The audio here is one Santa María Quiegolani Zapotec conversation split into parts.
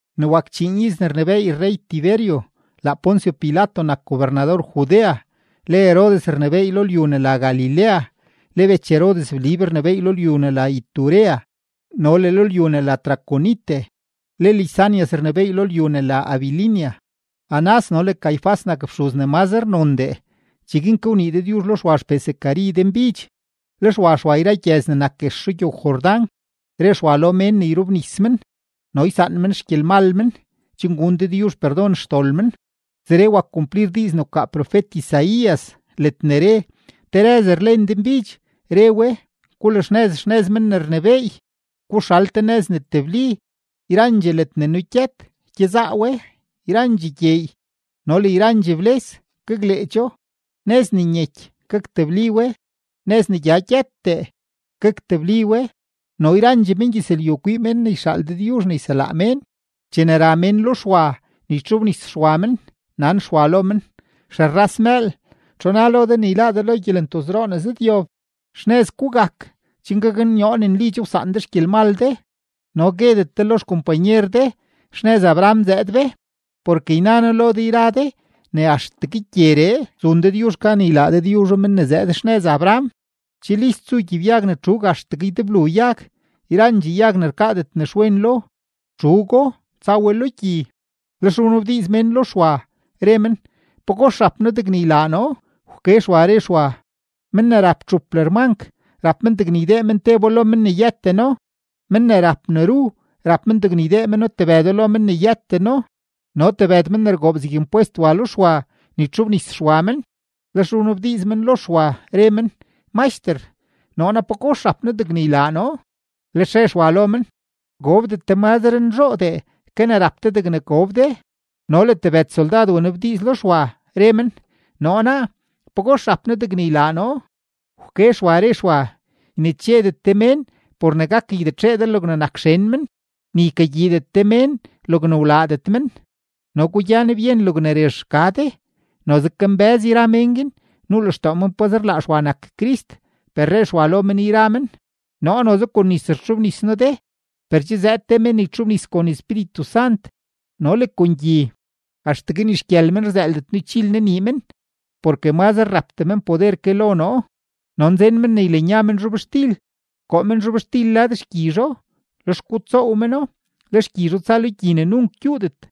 Ne wak chíín iz ne rnebééy rrey-Tiberio, laa Poncio Pilato nak gobernador Judea, le Herodes rnebééy lo lyu ne la Galilea, le bech Herodes Blib rnebééy lo lyu ne la Iturea no le lo lyu ne la Traconite, le Lisanias rnebééy lo lyu ne la Abilinia. Anás no le Caifás nak fxuz ne mazre nondee. Cheguin ke wnii Dëdyuzh lo Xwa xpee Zacari denbidx. Lex wa Xwa yra gyëz ne nak guex rugyow-Jordán, re Xwa lo mén ne yrobnis men no ysaan men xgyelmal men chen gun Dëdyuzh perdon xdol men. Zeree wak kumplir diiz ne wkaa profet-Isaías ledne re: Te rëz rlen denbidx, re we: “Gulaxnëz xnëz Men ne rnebééy, guxal te nëz ne tebli. Yrandxee ledne nugyët, gyezaa we; yrandxee gyeey no le yrandxee bles, gakleecho. Nëz ne nyeky, gaktebli we. Nëz ne gya gyëttee, gaktebli we. No yrandxee mengyëzlyu kwii mén ne yxaal Dëdyuzh ne yselaa mén.” Chene ra mén lo Xwa ne ytxobnis Xwa men, nan Xwa lo men: ―¡Xerras mëël! ¿Txu na lo de ne yláá de lo gyelentozroo ne zëdyob? Xnëz gugak chen gaknyoo ne nli che wsaan de xgyelmal de, no guedet de lo xkompanyer de: “Xnëz Abraham zëëd be”; porke yna noo lo de yra de ne axtegue gyeree zun Dëdyuzh gan ylaa Dëdyuzho men ne zëëd xnëz Abraham. Che list zu gyibyag ne txuug axtegue ydeblu yag; yrandxee yag ne rkaadet nexwen lo, txuugo, tsa we lo gyi. Lex wnabdiiz mén lo Xwa, re men: ―¿Pagox rap noo degne ylaa noo? Wke Xwa, re Xwa: ―Men ne rap txup lërmank, rap men degne ydee men tebo lo men ne yëteno; men ne rap ne ru, rap men degne ydee men tebëdo lo men ne yëteno. No tebëd men ne rgoob zeg impwest wa lo Xwa ne ytxobnis Xwa men, lex wnabdiiz men lo Xwa, re men: ―Maxter, ¿noo naa, pagox rap noo degne ylaa noo? Lex re Xwa lo men: ―Gobdet de mazre nzhoodee ke ne rap de degne gob de. No le tebëd soldad wnabdiiz lo Xwa, re men: ―¿Noo naa, pagox rap noo degne ylaa noo? Wke Xwa, re Xwa: ―Ynechedet de mén por ne gak ygyitxee de logne nak xen men, ni ykagyiidet de mén logne wlaadet men, no gugyan byen logne rezh rka de. Noze kambë́z yra mén guin, nuu lextoo men pazer laa Xwa nak Crist. Per re Xwa lo men yra men: ―Noo noze kon nis rtxobnis noo de, per che zëëd te men ne ytxobnis kon Espíritu Sant no le kon gyi. Axtegue ni xgyël men rzëëldet noo ychil noo nii men porke mazre rapdee men poder ke lo noo. No nzen men ne ylanya men zhobxtil, koo men zhobxtil lad xgyizho, lex gutsoow meno; le xgyizho tsa lo gyi ne nunk gyuudet.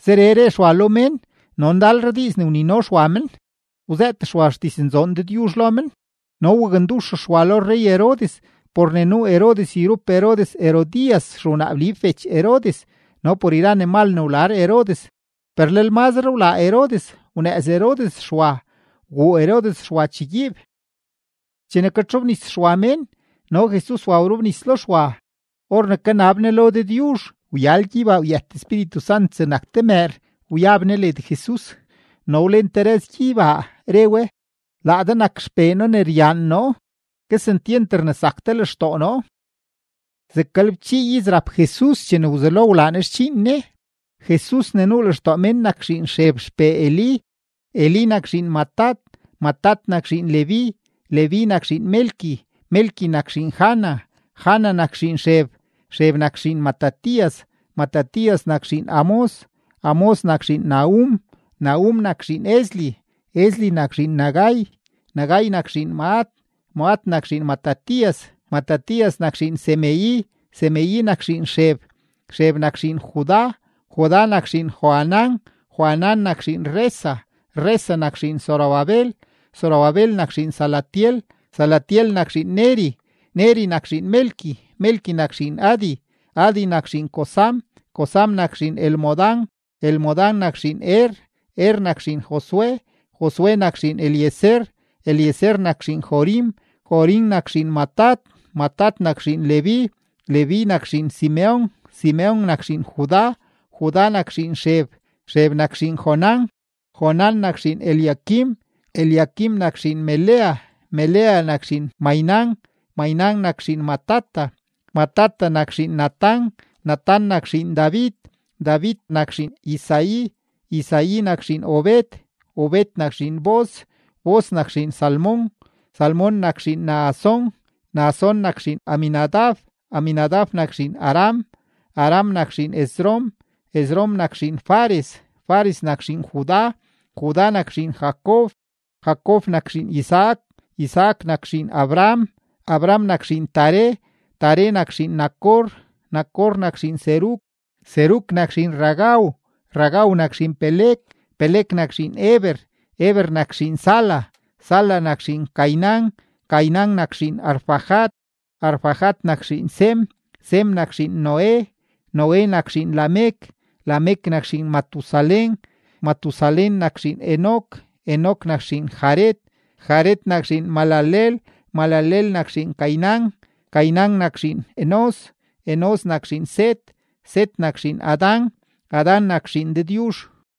Zeree re Xwa lo mén no ndalre diiz ne wnino Xwa men, wzëët Xwa xdiznzoon Dëdyuzh lo men. No wakndux Xwa lo rrey-Herodes por ne nuu Herodes yrup Herodes Herodías xewnaa Blib bech Herodes no por yra ne mal ne wlar Herodes. Per lel mazre wlaa Herodes, wnëëz Herodes Xwa, wguu Herodes Xwa chegyiib. Chene katxobnis Xwa mén, no Jesus wa wrobnis lo Xwa. Or ne kanab Ne lo Dëdyuzh, wyal gyeybaa, wyët Espíritu Sant zegnak te mëër, wyab Ne led Jesus, no wlen te rëz gyeybaa, re we: ―Laa de nak XPee noo ne ryaan noo; kesentyent rnesak de lextoo noo. Zeg galebchii iz rap Jesus chene wzelo Ne wlaa Ne xdxiin Ne. Jesus ne nuu lextoo mén nak zhiin Xeb xpee Elí, Elí nak zhiin Matat, Matat nak zhiin Leví, Leví nak zhiin Melqui, Melqui nak zhiin Jana, Jana nak zhiin Xeb, Xeb nak zhiin Matatías, Matatías nak zhiin Amós, Amós nak zhiin Nahum, Nahum nak zhiin Esli, Esli nak zhiin Nagai, Nagai nak zhiin Maat, Maat nak zhiin Matatías, Matatías nak zhiin Semei, Semei nak zhiin Xeb, Xeb nak zhiin Judá, Judá nak zhiin Joanán, Joanán nak zhiin Resa, Resa nak zhiin Zorobabel, Zorobabel nak zhiin Salatiel, Salatiel nak zhiin Neri, Neri nak zhiin Melqui, Melqui nak zhiin Adi, Adi nak zhiin Cosam, Cosam nak zhiin Elmodam, Elmodam nak zhiin Er, Er nak zhiin Josué, Josué nak zhiin Eliezer, Eliezer nak zhiin Jorim, Jorim nak zhiin Matat, Matat nak zhiin Leví, Leví nak zhiin Simeon, Simeon nak zhiin Judá, Judá nak zhiin Xeb, Xeb nak zhiin Jonán, Jonán nak zhiin Eliaquim, Eliaquim nak zhiin Melea, Melea nak zhiin Mainán, Mainán nak zhiin Matata, Matata nak zhiin Natán, Natán nak zhiin David, David nak zhiin Isaí, Isaí nak zhiin Obed, Obed nak zhiin Booz, Booz nak zhiin Salmón, Salmón nak zhiin Naasón, Naasón nak zhiin Aminadab, Aminadab nak zhiin Aram, Aram nak zhiin Esrom, Esrom nak zhiin Fares, Fares nak zhiin Judá, Judá nak zhiin Jacob, Jacob nak zhiin Isaac, Isaac nak zhiin Abraham, Abraham nak zhiin Taré, Taré nak zhiin Nacor, Nacor nak zhiin Serug, Serug nak zhiin Ragau, Ragau nak zhiin Peleg, Peleg nak zhiin Heber, Heber nak zhiin Sala, Sala nak zhiin Cainán, Cainán nak zhiin Arfaxad, Arfaxad nak zhiin Sem, Sem nak zhiin Noé, Noé nak zhiin Lamec, Lamec nak zhiin Matusalén, Matusalén nak zhiin Enoc, Enoc nak zhiin Jared, Jared nak zhiin Mahalaleel, Mahalaleel nak zhiin Cainán, Cainán nak zhiin Enós, Enós nak zhiin Set, Set nak zhiin Adán, Adán nak zhiin Dëdyuzh.